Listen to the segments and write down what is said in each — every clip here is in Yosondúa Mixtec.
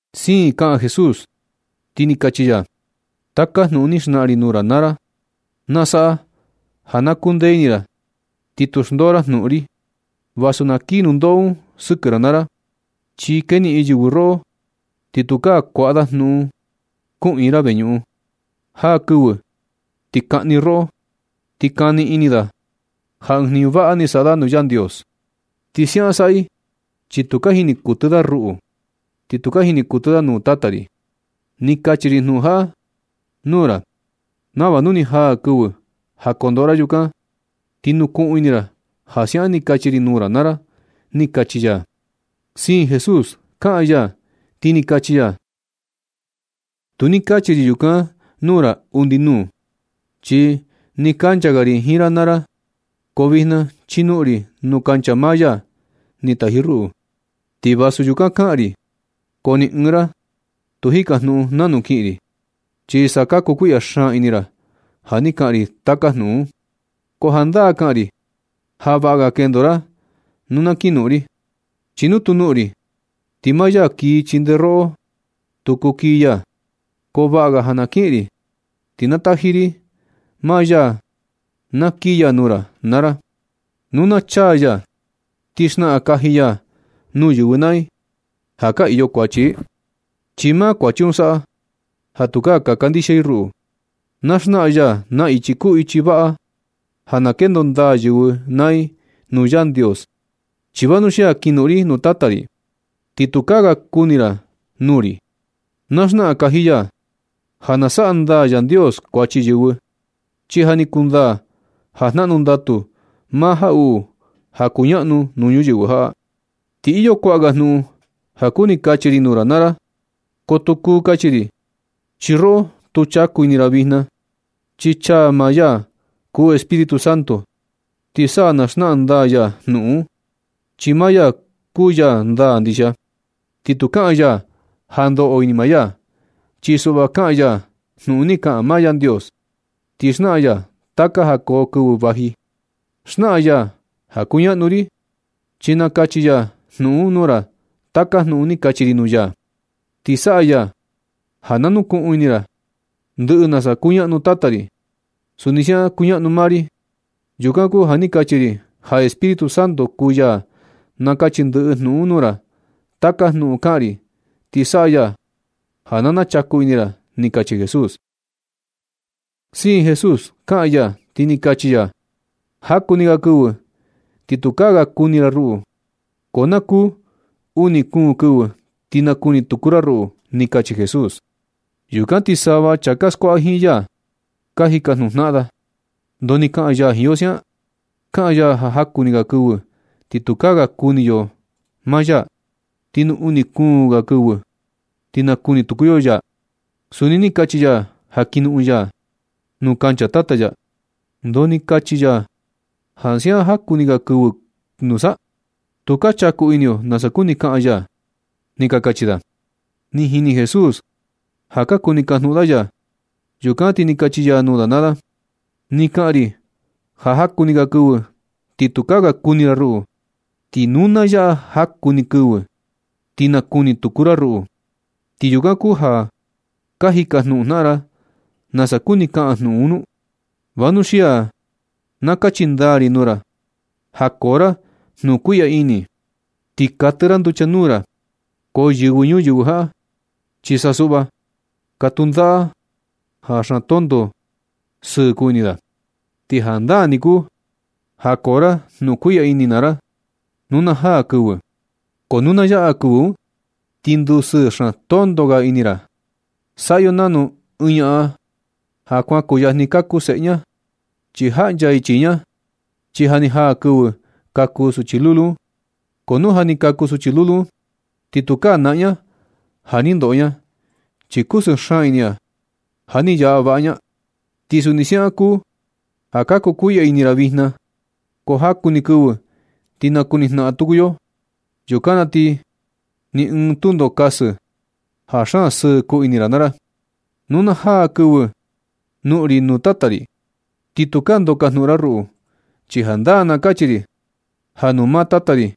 Siin kaꞌan Jesús, ti ni kachi ya: ―Taka jnuꞌun ni xnaꞌan ri nuu ra naa ra na saꞌa ja na kundee ini ra ti tu xndoo ra jnuꞌun ri, vasu na kii nundoꞌo un sɨkɨ ra naa ra. Chi keniꞌin yɨvɨ roꞌo ti tukaa kuaꞌa da jnuꞌun kuꞌiin ra veñuꞌun. Jaa kɨvɨ ti kaꞌni roꞌo, ti kani ini da ja ɨɨn jniñu vaꞌa ni saꞌa da nuu Yandios. Ti siaꞌan saꞌa i chi tu ka jini kuɨtɨ da ruꞌu, ni tu ka jini kuɨtɨ i nuu Tata ri. Ni kachi ri jnuꞌun jaꞌa nuu ra nava nu ni jaa kɨvɨ ja kondoꞌo ra, yukan na ti nukuꞌun ini ra ja siaꞌan ni kachi ri nuu ra naa ra ―ni kachi ya. Siin Jesús kaꞌan ya, ti ni kachi ya: ―Tu ni kachi ri yukan nuu ra undi nuu, chi nɨ kuncha ga ri jiin ra naa ra. Ko vijna chi kinoꞌon ri nuu kancha maa ya ni taji ruꞌu. Ti vasu yukan kaꞌan ri, ko ni ɨɨn ra tu ka jikajnuꞌun nanu kiꞌin ri. Chi sa ka kukuiꞌya xaan ini ra ja ni kaꞌan ri taka jnuꞌun un. Ko jandaa kaꞌan ri ja vaꞌa ga kendo ra nu na kinoꞌon ri. Chi nu tu noꞌon ri, ti maa ya kii chindee roꞌo, tu kuu kii ya. Ko vaꞌa ga na kiꞌin ri, ti na taji ri maa ya na kii ya nuu ra naa ra. Nu na chaa ya, ti na xnaꞌan kaji ya nuu yɨvɨ naa i ja ka iyo kuachi i, chi maa kuachi un saꞌa ja tu ka kandixia i ruꞌu. Na xnaꞌan ya na ichi kuu ichi vaꞌa ja na kendo ndaa yɨvɨ naa i nuu Yandios. Chi vanuxia kinoꞌon ri nuu Tata ri, ti tukaa ga kuni ra nuu ri. Na xnaꞌan kaji ya ja nasaꞌa ndaa Yandios kuachi yɨvɨ, chi ja ni kundaa ja jnaꞌnu ndatu maa jaꞌuꞌu ja kuñaꞌnu nuu ñuyɨvɨ jaꞌa. Ti iyo kuaꞌa ga jnuꞌun ja kuni kachi ri nuu ra naa ra. Ko tu kuu kachi ri, chi roꞌo tu chaku ini ra vijna. Na chaa maa ya kuu Espíritu Santo, ti sa na xnaꞌan ndaa ya jnuꞌun un, chi maa ya kuu ya ndaa ndixia. Ti tu kaꞌan ya ja ndoꞌo ini maa ya. Chi suꞌva, kaꞌan ya jnuꞌun ni kaꞌan maa Yandios. Ti xnaꞌan ya taka ja koo kɨvɨ vaji. Xnaꞌan ya ja kuñaꞌnu ri, chi nakachi ya jnuꞌun un nuu ra taka jnuꞌun ni kachi ri nuu ya, ti saꞌa ya ja na nukuꞌun ini ra. Ndɨꞌɨ nasa kuñaꞌnu Tata ri, suni siaꞌan kuñaꞌnu maa ri. Yukan kuu ja ni kachi ri ja Espíritu Santo kuu ya nakachi ndɨꞌɨ jnuꞌun un nuu ra taka jnuꞌun kaꞌan ri, ti saꞌa ya ja na chaku ini ra ―ni kachi Jesús. Siin Jesús kaꞌan ya, ti ni kachi ya: ―Jaku ni ga kɨvɨ ti tukaa ga kuni ra ruꞌu. Ko na kuu uni kuun kɨvɨ ti nakuni tuku ra ruꞌu ―ni kachi Jesús. Yukan ti sava chaa ka skuaꞌa jiin ya, ka jikajnuꞌun jnaꞌan da: ―¿Ndoo ni kaꞌan ya jiin yo siaꞌan? Kaꞌan ya ja jaku ni ga kɨvɨ ti tukaa ga kuni yo maa ya, ti nu na kuu ni ga kɨvɨ ti nakuni tuku yo ya. Suni ni kachi ya ja kin noꞌon ya nuu kancha Tata ya. ¿Ndoo ni kachi ya ja siaꞌa jaku ni ga kɨvɨ nusa? Tu ka chaku ini yo nasa kuni kaꞌan ya ―ni ka kachi da. Ni jini Jesús ja ka kuni kajnuꞌun da ya. Yukan ti ni kachi ya nuu da naa da: ―Ni kaꞌan ri ja jaku ni ga kɨvɨ ti tukaa ga kuni ra ruꞌu, ti nu na yaꞌa jaku ni kɨvɨ ti nakuni tuku ra ruꞌu. ¿Ti yukan kuu ja ka jikajnuꞌun jnaꞌan ra nasa kuni kaꞌan jnuꞌun un nu? Vanuxia na kachi ndaa ri nuu ra ja koo ra jnukuiꞌya ini ti katɨ ra nducha nuu ra. Ko yɨvɨ ñuyɨvɨ jaꞌa chi sa suꞌva katu ndaꞌa da ja xaan tonto sɨɨ kuu ini da. Ti jandaa ni kuu ja koo ra jnukuiꞌya ini naa ra nu na jaa kɨvɨ. Ko nu na yaꞌa kɨvɨ un ti ndusɨɨ xaan tonto ga ini ra. Saꞌa yo nanu. Ɨɨn ñaꞌan ja kuan kuyajni kaku seꞌe ña, ti jaꞌncha i chii ña, chi ja ni jaa kɨvɨ ja kaku suchi lulu un. Ko nu ja ni kaku suchi lulu un, ti tukaa naꞌan ña ja ni ndoꞌo ña, chi kusɨɨ xaan ini ña ja ni yaꞌa vaꞌa ña. Ti suni siaꞌan kuu ja ka kukuiꞌya ini ra vijna, ko jaku ni kɨvɨ ti nakuni jnaꞌan tuku yo. Yukan na ti ni ɨɨn tundo kasɨ ja xaan sɨɨ kuu ini ra naa ra. Nu na jaa kɨvɨ noꞌon ri nuu Tata ri, ti tukaa ndoo kajnuꞌun ra ruꞌu. Chi jandaa na kachi ri ja nuu maa Tata ri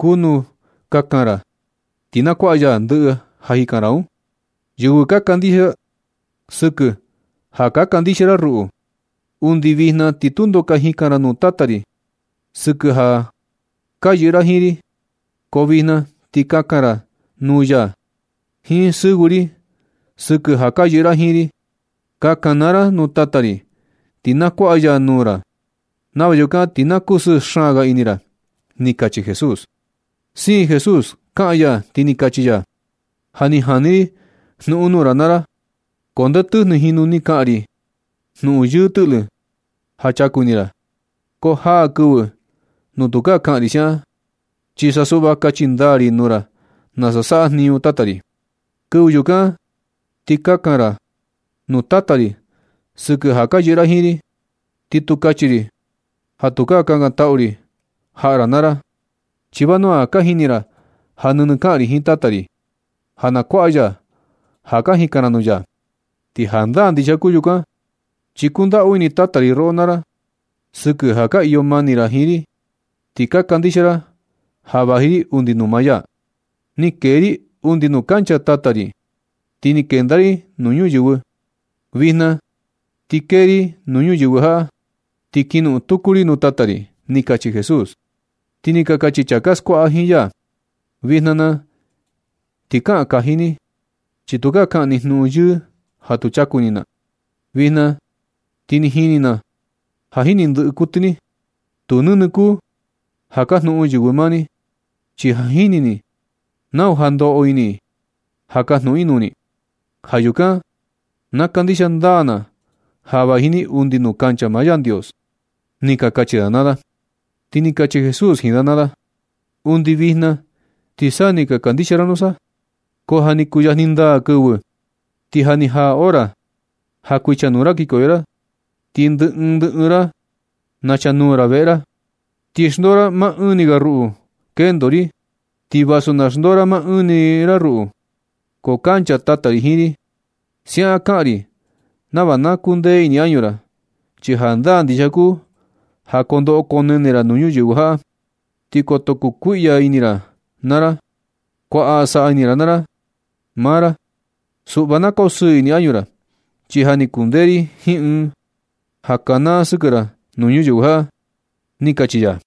kuu nu kakan ra, ti na kuaꞌa ya ndɨꞌɨ ja ka jikan ra, sɨkɨ ja ka kandixia ra ruꞌu. Undi vijna ti tundo ka jikan ra nuu Tata ri sɨkɨ ja ka yɨꞌɨ ra jiin ri. Ko vijna ti kakan ra nuu ya jiin sɨvɨ ri sɨkɨ ja ka yɨꞌɨ ra jiin ri. Kakan naa ra nuu Tata ri, ti na kuaꞌa ya nuu ra, nava yukan ti na kusɨɨ xaan ga ini ra ―ni kachi Jesús. Siin Jesús kaꞌan ya, ti ni kachi ya: ―Ja ni jani ri jnuꞌun nuu ra naa ra, ko ndee tɨjnɨ jinu ni kaꞌan ri jnuꞌun yɨɨ tɨꞌlɨ ja chaku ini ra. Ko jaa kɨvɨ nuu tukaa kaꞌan ri siaꞌan, chi sa suꞌva kachi ndaa ri nuu ra nasa saꞌa jniñu Tata ri. Kɨvɨ yukan na ti kakan ra nuu Tata ri sɨkɨ ja ka yɨꞌɨ ra jiin ri. Ti tu kachi ri ja tukaa kakantaꞌu ri jaꞌa ra naa ra, chi vanua ja ka jini ra ja nɨnɨ kaꞌan ri jiin Tata ri ja na kuaꞌa ya ja ka jikan ra nuu ya. Ti jandaa ndixia kuu yukan, chi kundaꞌu ini Tata ri roꞌo naa ra sɨkɨ ja ka iyo mani ra jiin ri, ti ka kandixia ra ja vaji ri undi nuu maa ya. Ni kee ri undi nuu kancha Tata ri, ti ni kenda ri nuu ñuyɨvɨ. Vijna ti kee ri nuu ñuyɨvɨ jaꞌa, ti kinoꞌon tuku ri nuu Tata ri ―ni kachi Jesús. Ti ni ka kachi chaa ka skuaꞌa jiin ya: ―Vijna na ti kaꞌan kaji ni, chi tukaa kaꞌan ni jnuꞌun yɨɨ ja tu chaku ini na. Vijna ti ni jini na ja jini ndɨꞌɨ kuɨtɨ ni. Tu nɨnɨ kuu ja kajnuꞌun yɨvɨ maa ni, chi ja jini ni nau ja ndoꞌo ini i ja kajnuꞌun i nuu ni. Ja yukan na kandixia ndaa na ja vaji ni undi nuu kancha maa Yandios ―ni ka kachi da naa da. Ti ni kachi Jesús jiin da naa da: ―Undi vijna ti sa ni ka kandixia nusa. Ko ja ni kuyajni ndaa kɨvɨ, ti ja ni jaa hora ja kuichanuu ra kinkoyo ra, ti ndɨ ɨɨn ndɨ ɨɨn ra nachanuu ra veꞌe ra. Ti xndoo ra maa ɨɨn ni ga ruꞌu kendo ri. Ti vasu na xndoo maa ɨɨn ra ruꞌu, ko kancha Tata ri jiin ri. Siaꞌan kaꞌan ri nava na kukuee undi ini añu ra. Chi jandaa ndixia kuu ja kondoꞌo konene ra nuu ñuyɨvɨ jaꞌa, ti koto ndukuiꞌya ini ra naa ra, kuaꞌa saꞌa ini ra naa ra maa ra, suꞌva na kosɨɨ ini añu ra, chi ja ni kundee ri jiin ɨɨn ja kanaa sɨkɨ ra nuu ñuyɨvɨ jaꞌa ―ni kachi ya.